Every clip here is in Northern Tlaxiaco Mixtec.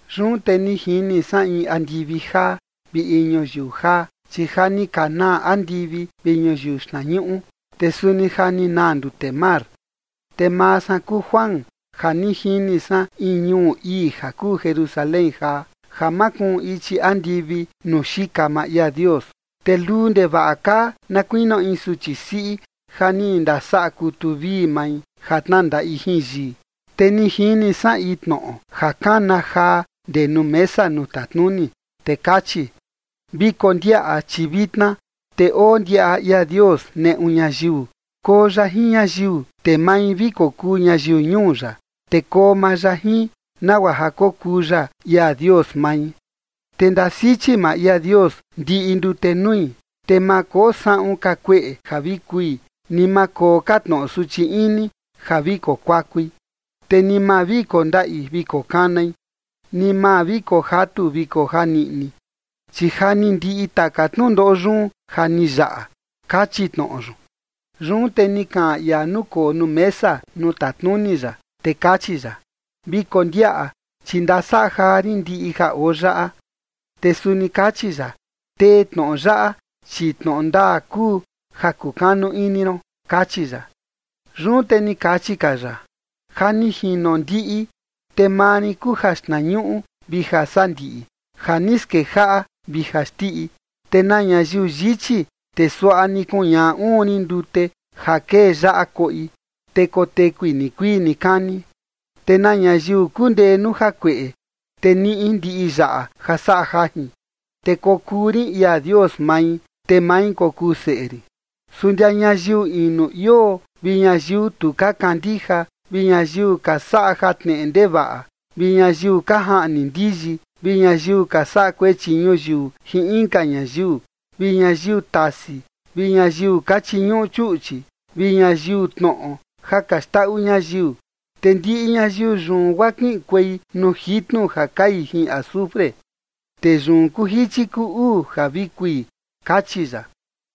Yun te ni jini san in andivi jaa vi in ñuyiu jaa. Chi ja ni ka naa andivi vi ñuyiu xtnañuꞌu, te suni ja ni naa ndute mar. Te maa san kuu Juan ja ni jini san in ñuu ii ja kuu Jerusalén jaa, ja makuun ichi andivi nuu xika maa ia Dios. Te luu ndevaꞌa kaa na kuinio in suchi siꞌi ja ni ndasaꞌa kutu vii mai ja tnandaꞌi jin yii. Te ni jini san in tnoꞌo ja kana jaa ndee nuu mesa nuu tatnuni, te kachi: ―Vi kondiaꞌa chi vitna, te oo ndiaꞌa ia Dios neꞌu ñayiu. Koo ya jin ñayiu, te mai vi kokuu ñayiu ñuu ya, te koo maa ya jin, nagua ja kokuu ya ia Dios mai. Te ndasichi maa ia Dios ndiꞌi ndute nui, te ma koo saꞌun ka kueꞌe ja vi kui, ni ma koo ka tnoꞌo suchi ini ja vi kokuakui, te ni ma vi kondaꞌi vi kokanai, ni ma vi kojatu vi kojaniꞌni, chi ja ni ndiꞌi taka tnundoꞌo yun ja ni yaꞌa ―kachi tnoꞌo yun. Yun te ni kaꞌan ia nukoo nuu mesa nuu tatnuni ya, te kachi ya: ―Vi kondiaꞌa, chi ndasaꞌa jaa rin ndiꞌi ja oo yaꞌa. Te suni kachi ya: ―Tee tnoꞌo yaꞌa, chi tnoꞌo ndaa kuu ja kukanu ini ron ―kachi ya. Yun te kachi ka ya: ―Ja ni jino ndiꞌi. Te maa rin kuu jaxtnañuꞌu vi jasandiꞌi, ja ni skejaꞌa vi jaxndiꞌi. Te na ñayiu yichi, te suaꞌa ni kuñaꞌa uun rin ndute ja kee yaꞌa koꞌi, te kotekui nikuii nikani. Te na ñayiu kundee nuu jakueꞌe, te niꞌi ndiꞌi yaꞌa ja saꞌa jajin, te kokuu rin ia Dios mai, te mai kokuu seꞌe rin. Su ndia ñayiu inu ioo vi ñayiu tu ka kandija, vi ñayiu ka saꞌa jatneꞌe ndevaꞌa, vi ñayiu ka jaꞌni ndiyi, vi ñayiu ka saꞌa kuechi ñuyiu jin inka ñayiu, vi ñayiu tasi, vi ñayiu ka chiñuꞌu chuꞌchi, vi ñayiu tnoꞌo ja ka xndaꞌu ñayiu, te ndiꞌi ñayiu yun guaa kiꞌinkuei nuu jitnu ja kai jin azufre. Te yun kuu jichi kuu uu ja vi kui ―kachi ya.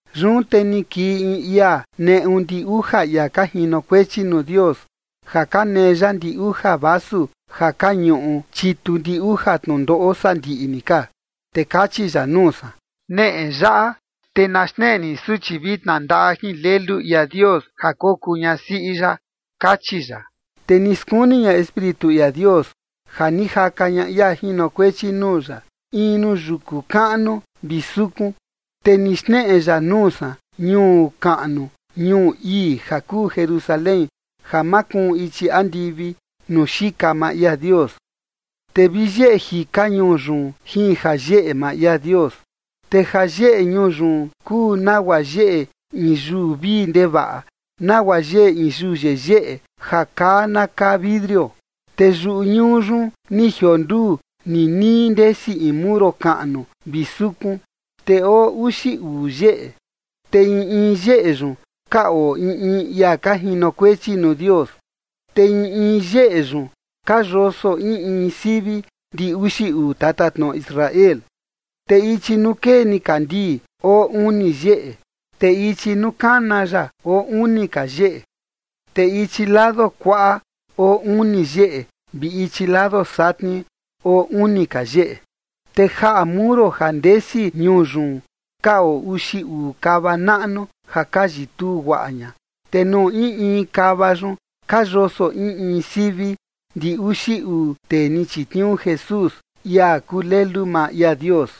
Yun te ni kii in ia neꞌu ndi uja ia ka jinokuechi nuu Dios ja ka nee ya ndi uja vasu ja ka ñuꞌu chitu ndi uja tnundoꞌo sandiꞌi ni ka, te kachi ya nuu san: ―Neꞌe yaꞌa, te na xneꞌe rin suchi vi tnandaꞌa jin Lelu ia Dios ja kokuu ñasiꞌi ya ―kachi ya. Te ni skuni ña Espíritu ia Dios ja ni jaka ña ia jinokuechi nuu ya in nuu yuku kaꞌnu vi sukun. Te ni xneꞌe ya nuu san ñuu kaꞌnu ñuu ii ja kuu Jerusalén ja makuun ichi andivi nuu xika maa ia Dios. Te vi yeꞌe jika ñuu yun jin jayeꞌe maa ia Dios. Te jayeꞌe ñuu yun kuu nagua yeꞌe in yuu vii ndevaꞌa, nagua yeꞌe in yuu yeyeꞌe ja kaa na kaa vidrio. Te yuꞌu ñuu yun ni jionduu ninii ndesi in muro kaꞌnu vi sukun, te oo uxi uu yeꞌe, te in in yeꞌe yun ka oo in in ia ka jinokuechi nuu Dios. Te in in yeꞌe yun ka yoso in in sivi ndi uxi uu tatatnoꞌo Israel. Te ichi nuu kee nikandii oo uni yeꞌe, te ichi nuu kana ya oo uni ka yeꞌe, te ichi lado kuaꞌa oo uni yeꞌe, vi ichi lado satni oo uni ka yeꞌe. Te jaꞌa muro ja ndesi ñuu yun ka oo uxi uu kava naꞌnu ja ka yituu guaꞌa ña, te nuu in in kava yun ka yoso in in sivi ndi uxi uu tee ni chitniuu Jesús, ia kuu Lelu maa ia Dios.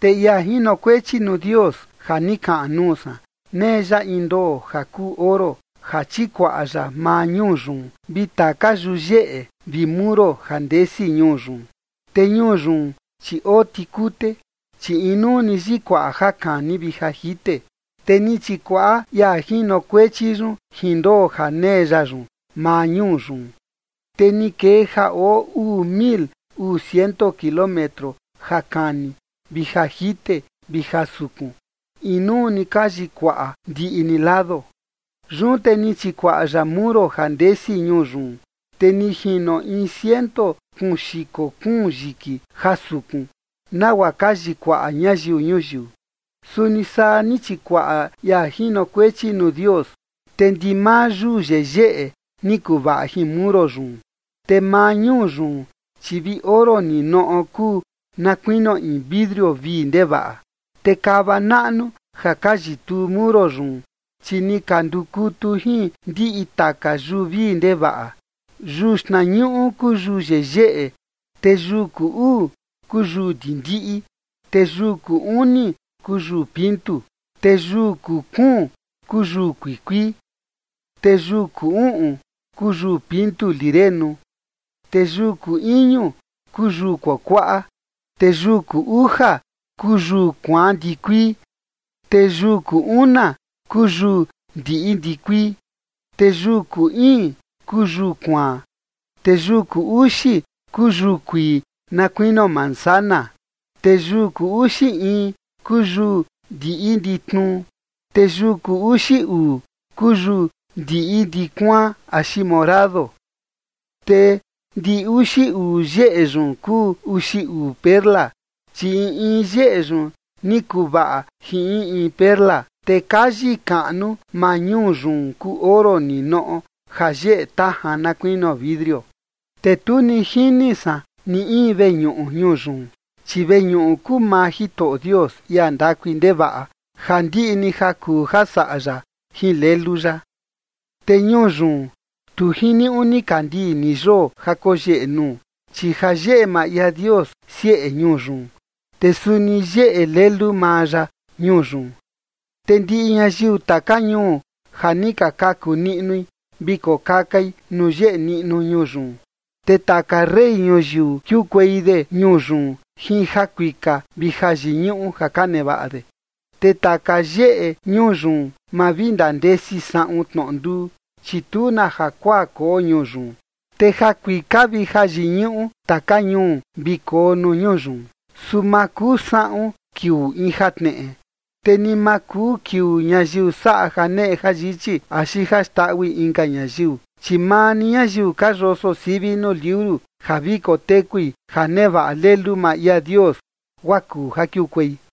Te ia jinokuechi nuu Dios ja ni kaꞌan nuu san, nee ya in ndoo ja kuu oro ja chikuaꞌa ya maa ñuu yun vi taka yuyeꞌe vi muro ja ndesi ñuu yun. Te ñuu yun, chi oo tikute, chi inuu ni yikuaꞌa ja kani vi ja jite. Te ni chikuaꞌa ia jinokuechi yun jin ndoo ja nee ya yun maa ñuu yun. Te ni kee ja oo uu mil uu ciento kilómetro ja kani vi ja jite vi ja sukun, inuu ni ka yikuaꞌa ndiꞌi ni lado. Yun te ni chikuaꞌa ya muro ja ndesi ñuu yun, te ni jino in ciento kuun xiko kuun yiki ja sukun nagua ka chikuaꞌa ñayiu ñuyiu, suni saa ni chikuaꞌa ia jinokuechi nuu Dios. Te ndimaa yuu yeyeꞌe ni kuvaꞌa jin muro yun, te maa ñuu yun, chi vi oro ninoꞌo kuu na kuinio in vidrio vii ndevaꞌa. Te kava naꞌnu ja ka yituu muro yun, chi ni ka ndukutu jin ndiꞌi taka yuu vii ndevaꞌa. Yuu xtnañuꞌu kuu yuu yeyeꞌe, te yuu kuu uu kuu yuu ndindiꞌi, te yuu kuu uni kuu yuu pintu, te yuu kuu kuun kuu yuu kuikuii. Te yuu kuu uꞌun kuu yuu pintu lirenu, te yuu kuu iñu kuu yuu kuakuaꞌa, te yuu kuu uja kuu yuu kuaan ndikuii, te yuu kuu una kuu yuu ndiꞌi ndikuii, te yuu kuu iin kuu yuu kuaan, te yuu kuu uxi kuu yuu kuii na kuinio manzana, te yuu kuu uxi in kuu yuu ndiꞌi nditnuu, te yuu kuu uxi uu kuu yuu ndiꞌi ndikuaꞌa axi morado. Te ndi uxi uu yeꞌe yun kuu uxi uu perla, chi in in yeꞌe yun ni kuvaꞌa jin in in perla, te kayi kaꞌnu maa ñuu yun kuu oro ninoꞌo ja yeꞌe tajan na kuinio vidrio. Te tu ni jini san ni in veñuꞌu ñuu yun, chi veñuꞌu kuu maa Jitoꞌo Dios, ia ndakui ndevaꞌa ja ndiꞌi ni ja kuu ja saꞌa ya jin Lelu ya. Te ñuu yun, tu jiniuꞌu nikandii ni yoo ja koyeꞌe nuu, chi jayeꞌe maa ia Dios sieꞌe ñuu yun, te suni yeꞌe Lelu maa ya ñuu yun. Te ndiꞌi ñayiu taka ñuu ja ni ka kaku niꞌnui vi kokakai nuu yeꞌe niꞌnu ñuu yun. Te taka rey ñuyiu kiukuei de ñuu yun jin jakuika vi jayiñuꞌu ja ka nevaꞌa de. Te taka yeꞌe ñuu yun, ma vi ndandesi saꞌun tnoꞌo nduu, chi tu na jakuaa koo ñuu yun. Te jakuika vi jayiñuꞌu taka ñuu vi koo nuu ñuu yun. Su ma kuu saꞌun kiuu in jatneꞌe. Te ni ma kuu kiuu ñayiu saꞌa janeꞌe jayichi axi ja xndaꞌui inka ñayiu, chi maa ni ñayiu ka yoso sivi nuu liuru ja vi kotekui ja nevaꞌa Lelu maa ia Dios, guaa kuu ja kiukuei.